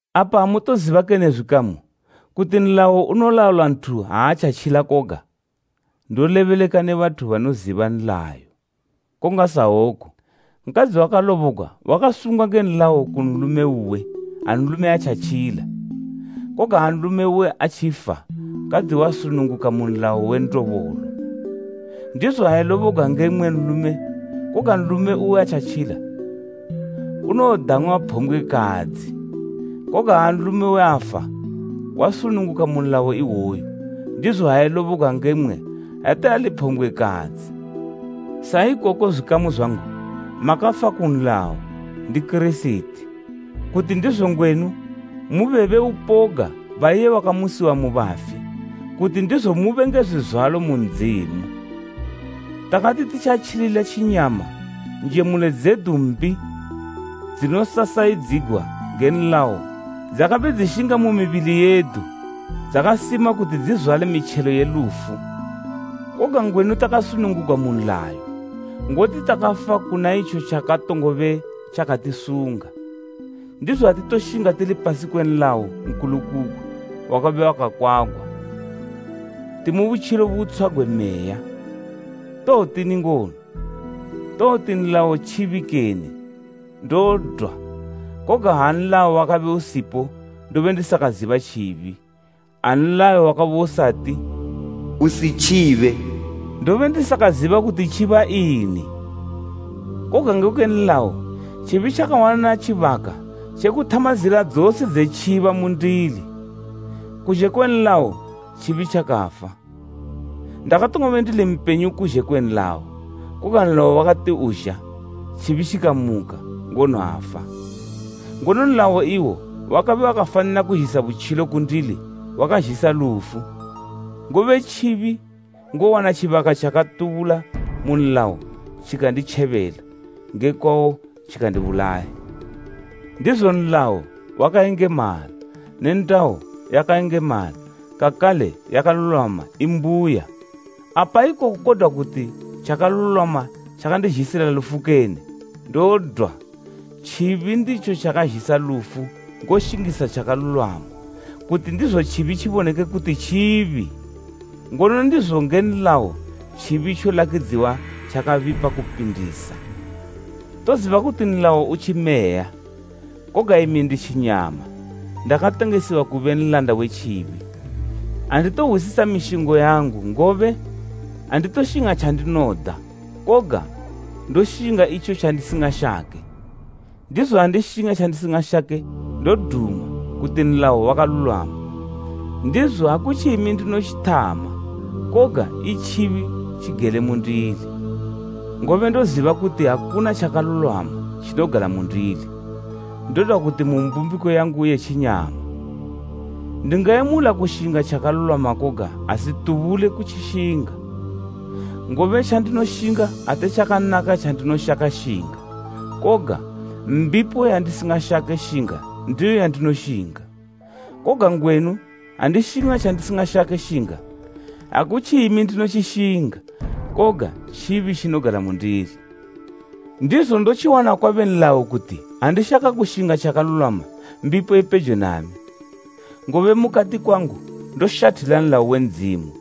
Apa amutoziba kene zwikamu kuti nlayo unolaula nthu ha atjatjila koga? Ndolebeleka ne bathu banoziba nlayo. Kongasawoku nkadzi wakalobogwa wakasungwa nge nlayo ku nlume uwe ha nlume atjatjila, koga ha nlume uwe atjifa nkadzi wasununguka mu nlayo we ndobolo. Ndizo ha elobogwa nge mmwe nlume koga nlume uwe atjatjila, unowodang'wa phombgwekadzi. Koga ha nlume uwe afa, wasununguka mu nlayo iwoyu, ndizo ha elobogwa nge mmwe ate ali phombgwekadzi. Saikoko zwikamu zwangu makafa ku nlayo, ndi Kirisiti, kuti ndizo ngwenu mube be upoga ba iye wakamusiwa mu bafi, kuti ndizo mube nge zwizwalo mu Ndzimu. Takati titjatjilila tjinyama njemulo dzedu mbi dzinosasayidzigwa nge nlayo dzakabe dzishinga mu mibili yedu, dzakasima kuti dzizwale mitjelo ye lufu. Koga ngwenu takasunungugwa mu nlayo, ngoti takafa kuna itjo tjakatongobe tjakatisunga. Ndizo atitoshinga tili pasi kwe nlayo nkulukugwi wakabe wakakwagwa, timu butjilo butshwa gwe Meya. Towotini ngono? Towoti nlayo tjibi kene? Ndodwa! Koga ha nlayo wakabe usipo ndobe ndisakaziba tjibi. Ha nlayo wakabe usati, “Usitjibe” ndobe ndisakaziba kuti tjiba ini. Koga ngekwe nlayo tjibi tjakawana tjibaka tje kuthama zila dzose dze tjiba mundili. Kuzhe kwe nlayo tjibi tjakafa. Ndakatongobe ndili mpenyu kuzhe kwe nlayo, koga nlayo wakati uzha, tjibi tjikamuka, ngono afa. Ngono nlayo iwo wakabe wakafanila kuzhisa butjilo, ku ndili wakazhisa lufu. Ngobe tjibi ngowana tjibaka tjakatubula mu nlayo tjikanditjebela, nge kwawo tjikandibulaya. Ndizo nlayo wakayengemala ne ndayo yakayengemala kakale yakalulwama imbuya. Apa ikoku kodwa kuti tjakalulwama tjakandizhisila lufu kene? Ndodwa! Tjibi nditjo tjakazhisa lufu ngoshingisa tjakalulwama, kuti ndizo tjibi tjiboneke kuti tjibi. Ngono ndizo nge nlayo tjibi tjolakidziwa tjakabipa kupindisa. Toziba kuti nlayo u tjimeya, koga imi ndi tjinyama, ndakatengesiwa kube nlanda we tjibi. Anditohwisisa mishingo yangu, ngobe anditoshinga tjandinoda koga ndoshinga itjo tjandisingashake. Ndizo ha ndishinga tjandisingashake ndoduma kuti nlayo wakalulwama. Ndizo akutji imi ndinotjithama koga i tjibi tjigele mundili. Ngobe ndoziba kuti akuna tjakalulwama tjinogala mundili, ndodwa kuti mu mbumbiko yangu ye tjinyama. Ndingayemula kushinga tjakalulwama koga asitubule kutjishinga; ngobe tjandinoshinga ate tjakanaka tjandinoshaka shinga, koga, mbipo yandisingashake shinga ndiyo yandinoshinga. Koga ngwenu andishinga tjandisingashake shinga, akutji imi ndinotjishinga koga tjibi tjinogala mundili. Ndizo ndotjiwana kwabe nlayo kuti ha ndishaka kushinga tjakalulwama, mbipo ipejo nami. Ngobe mukati kwangu ndoshathila nlayo we Ndzimu,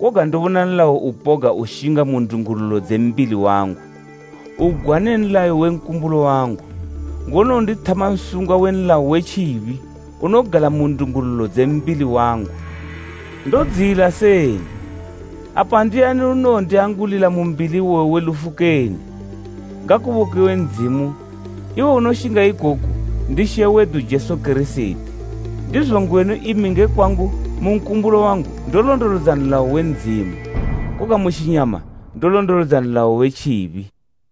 koga ndobona nlayo upoga ushinga mu ndungululo dze mbili wangu, ugwa ne nlayo we nkumbulo wangu, ngono undithama nsungwa we nlayo we tjibi unogala mu ndungululo dze mbili wangu. Ndodziyila seni! Apa ndiani unowondiangulila mu mbili iwoyu we lufu kene? Ngakubokiwe Ndzimu, iwo unoshinga ikoku ndi She wedu Jesu Kirisiti! Ndizo ngwenu imi nge kwangu mu nkumbulo wangu ndolondolodza nlayo we Ndzimu, koga mu tjinyama ndolondolodza nlayo we tjibi.